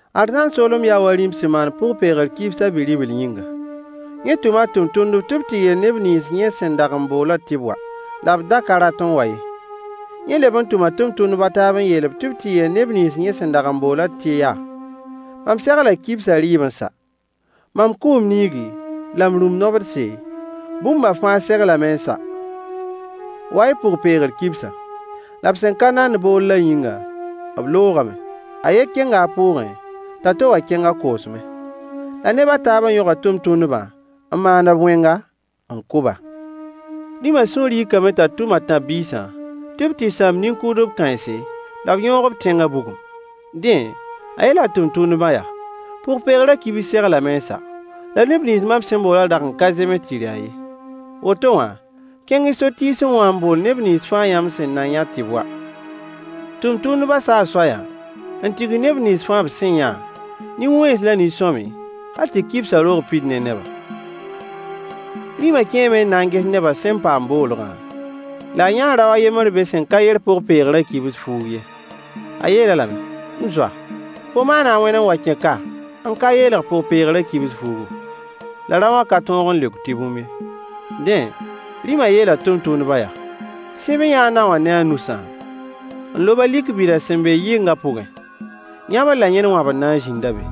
Arzãn soolem yaa wa rĩm sẽn maan pʋg-peegr kibs a bi-ribl yĩnga. Yẽ tʋma a tʋmtʋmdb tɩ b tɩ yeel neb nins yẽ sẽn dag n boolã tɩ b wa, la b da ka rat n wa ye. Yẽ leb n tʋma tʋmtʋmdb a taab n yeel-b tɩ b tɩ yeel neb nins yẽ sẽn dag n boolã tɩ yaa: “Mam segla kibsã rɩɩb n sa, mam kʋʋ m niigi la m rũm-nobdse, bũmba fãa seglame n sa. Wa-y pʋg-peegr kibsã.” La b sẽn ka nand boollã yĩnga, b loogame. A yen kẽnga a pʋʋgẽ, t'a to wã kẽng a koosmẽ. La neb a taabã yõga tʋmtʋmdbã n maan-b wẽnga, n kʋ-ba. Rĩmã sũur yikame t'a tʋm a tãb-biisã tɩ b tɩ sãam nin-kʋʋdb kãense, la b yõog b tẽngã bugum. Dẽ, a yeela a tʋmtʋmdbã yaa: “Pʋg-peegrã kibs seglame n sa. La neb nins mam sẽn boolã dag n ka zems tɩ rɩ-a ye. Woto wã, kẽng-y so-tiisẽ wã n bool neb nins fãa yãmb sẽn na yã tɩ b wa.” Tʋmtʋmdbã saa soayã n tigs neb nins fãa b sẽn yã, nin-wẽns la nin-sõamy, hal tɩ kibsã roog pid ne neba. Rĩmã kẽeme n na n ges nebã sẽn paam boolgã, la a yãa rao a yembr be sẽn ka yer pʋg-peegrã kibs fuug ye. A yeel-a lame: “M zoa, fo maana a wãn n wa n kẽ ka n ka yeelg pʋg-peegrã kibs fuugu?” La raowã ka tõog n leok tɩ bũmb ye. Dẽ, rĩmã yeela tʋmtʋmdbã yaa: “Sẽb-y-yã a naowã ne a nusã, n lob-a lik bida sẽn be yɩngã pʋgẽ. Yãbr la yẽn wãbr na n zĩnda be.”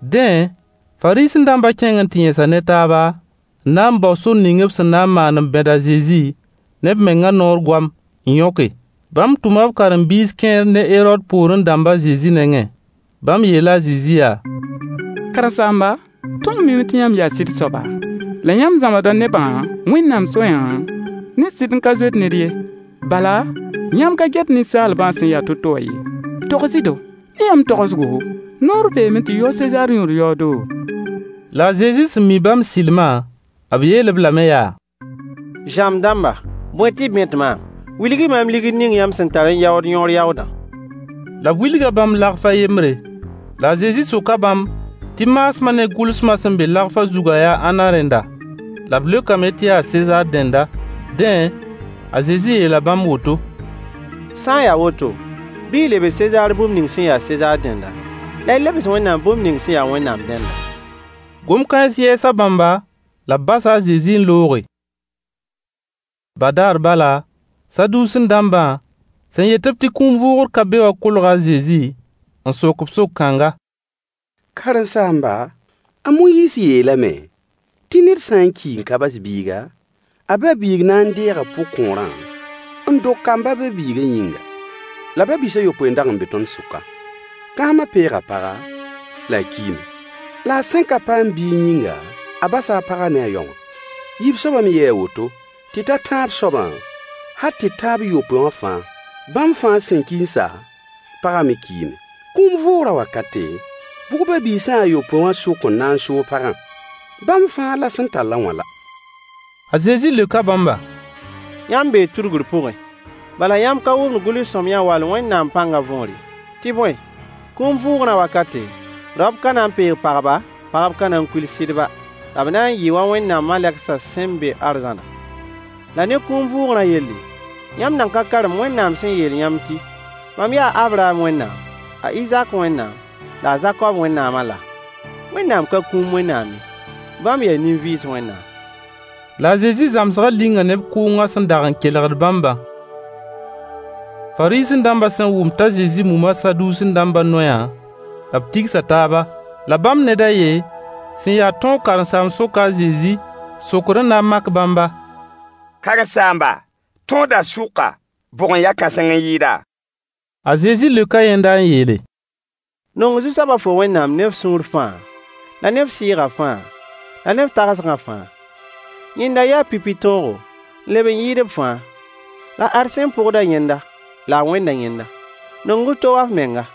Dẽ, Fariisẽ-dãmbã kẽng n tɩ yẽsa ne taaba n na n bao sor ning b sẽn na n maan n bẽd a Zezi ne b mengã noor goam n yõke. Bãmb tʋma b karen-biis kẽer ne Herood poorẽ dãmb a Zezi nengẽ. Bãmb yeela a Zezi yaa: Karen-saamba, tõnd miime tɩ yãmb yaa sɩd soaba, la yãmb zãmsda nebã Wẽnnaam soayã ne sɩd n ka zoet ned ye. Bala yãmb ka get ninsaalbã sẽn ya to-to wã ye. Togs-y-do. Ne yãmb tagsgo, noor beeme tɩ yao Sezaar yõor yaoodo? La a Zezi sẽn mi bãmb sɩlmã, b yeel-b lame yaa: Zãmb dãmba, bõe tɩ y bẽt maam? Wilg-y maam ligd ning yãmb sẽn tar n yaood yõor yaoodã. La b wilga bãmb deniye a yembre. La a Zezi soka bãmb tɩ maasmã ne gʋlsmã sẽn be lagfã zugã yaa ãnna dẽnda? La b leokame tɩ yaa Sezaar dẽnda. Dẽ a Zezi yeela bãmb woto: Sã n ya woto, bɩ y lebs Sezaar bũmb ning sẽn ya Sezaar dẽnda, la y lebs Wẽnnaam bũmb ning sẽn ya Wẽnnaam dẽnda. Gom-kãens yɛɛsa bãmba, la b basa a Zezi n looge. Badaar bala, Saduusẽ-dãmbã, sẽn yet-b tɩ kũum vʋʋgr ka be wã kolga a Zezi n sok-b sok-kãnga: Karen-saamba, a Moyiis yeelame “tɩ ned sã n ki n ka bas biiga, a ba-biig na n deega pʋgkõorã n dog kamb a ba-biigã yĩnga.” La ba-biis a yopoe n dag n be tõnd sʋka. Kãsmã peega paga, la a kiime. La a sẽn ka paam biig yĩnga, a basa a pagã ne a yaowã. Yiib soabã me yɩɩ a woto, tɩ ta tãab soabã, hal tɩ ta b yopoe wã fãa. Bãmb fãa sẽn ki n sa, pagã me kiime. Kũum vʋʋgrã wakate, bʋg ba-biisã a yopoe wã sʋk n na n soog pagã? Bãmb fãa la sẽn tall-a wã la! A Zezi leoka bãmba: Yãmb bee tudgr pʋgẽ, bala yãmb ka wʋmd gʋls-sõamyã wall Wẽnnaam pãngã võor ye. Tɩ bõe, kũum vʋʋgrã wakate, raop ka na n peeg pagba, pagb ka na n kuil sɩdba, la b na n yɩɩ wa Wẽnnaam malegsã sẽn be arzãnã. La ne kũum vʋʋgrã yelle, yãmb nan ka karem Wẽnnaam sẽn yeel yãmb tɩ: “Mam yaa a Abraham Wẽnnaam, a Izak Wẽnnaam, la a Zakob Wẽnnaamã” laa? Wẽnnaam ka kũum Wẽnnaam ye, bãmb yaa nin-vɩɩs Wẽnnaam. La a Zezi zãmsgã linga neb kʋʋngã sẽn dag n kelgd bãmbã. Fariisẽ-dãmbã sẽn wʋm t'a Zezi muma Saduusẽ-dãmbã noeyã, b tigsa taaba. La bãmb ned a yen sẽn ya tõog karen-saamb soka a Zezi sokr n na n mak bãmba: Karen-saamba, tõodã sʋka, bʋg n ya kãseng n yɩɩda? A Zezi leoka yẽnda n yeele: “Nong Zu-soaba fo Wẽnnaam ne f sũur fãa, la ne f sɩɩgã fãa, la ne f tagsgã fãa.” Yẽnda n ya pipi tõogo, n leb n yɩɩd b fãa. La ad sẽn pʋgd-a yẽnda, la a wẽnda yẽnda: “Nong f to wa f menga.”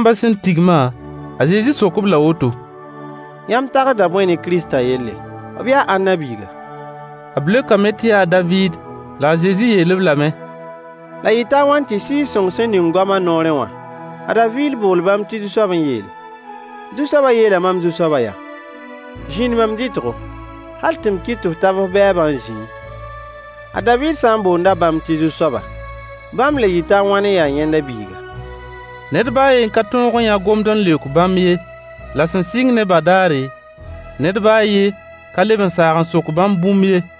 Fariisẽ-dãmbã sẽn tigma, a Zezi sok-b-la woto: Yãmb tagsda bõe ne Kiristã yelle? B yaa ãnna biiga? B leokame tɩ yaa a David. La a Zezi yeel-b lame: La yɩta a wãn tɩ Sɩɩg-sõng sẽn ning goam a noorẽ wã, a David bool bãmb tɩ Zu-soab n yeele: “Zu-soabã yeela mam Zu-soaba yaa: Zĩnd mam dɩtgo, hal tɩ m kɩt tɩ f tab f bɛɛbã n zĩẽ?” A David sã n boonda bãmb tɩ Zu-soaba, bãmb le yɩta wãn n ya yẽnda biiga? Ned baa a yen ka tõog n yã gomd n leok bãmb ye. La sẽn sɩng ne badaare, ned baa a yen ka leb n saag n sok bãmb bũmb ye.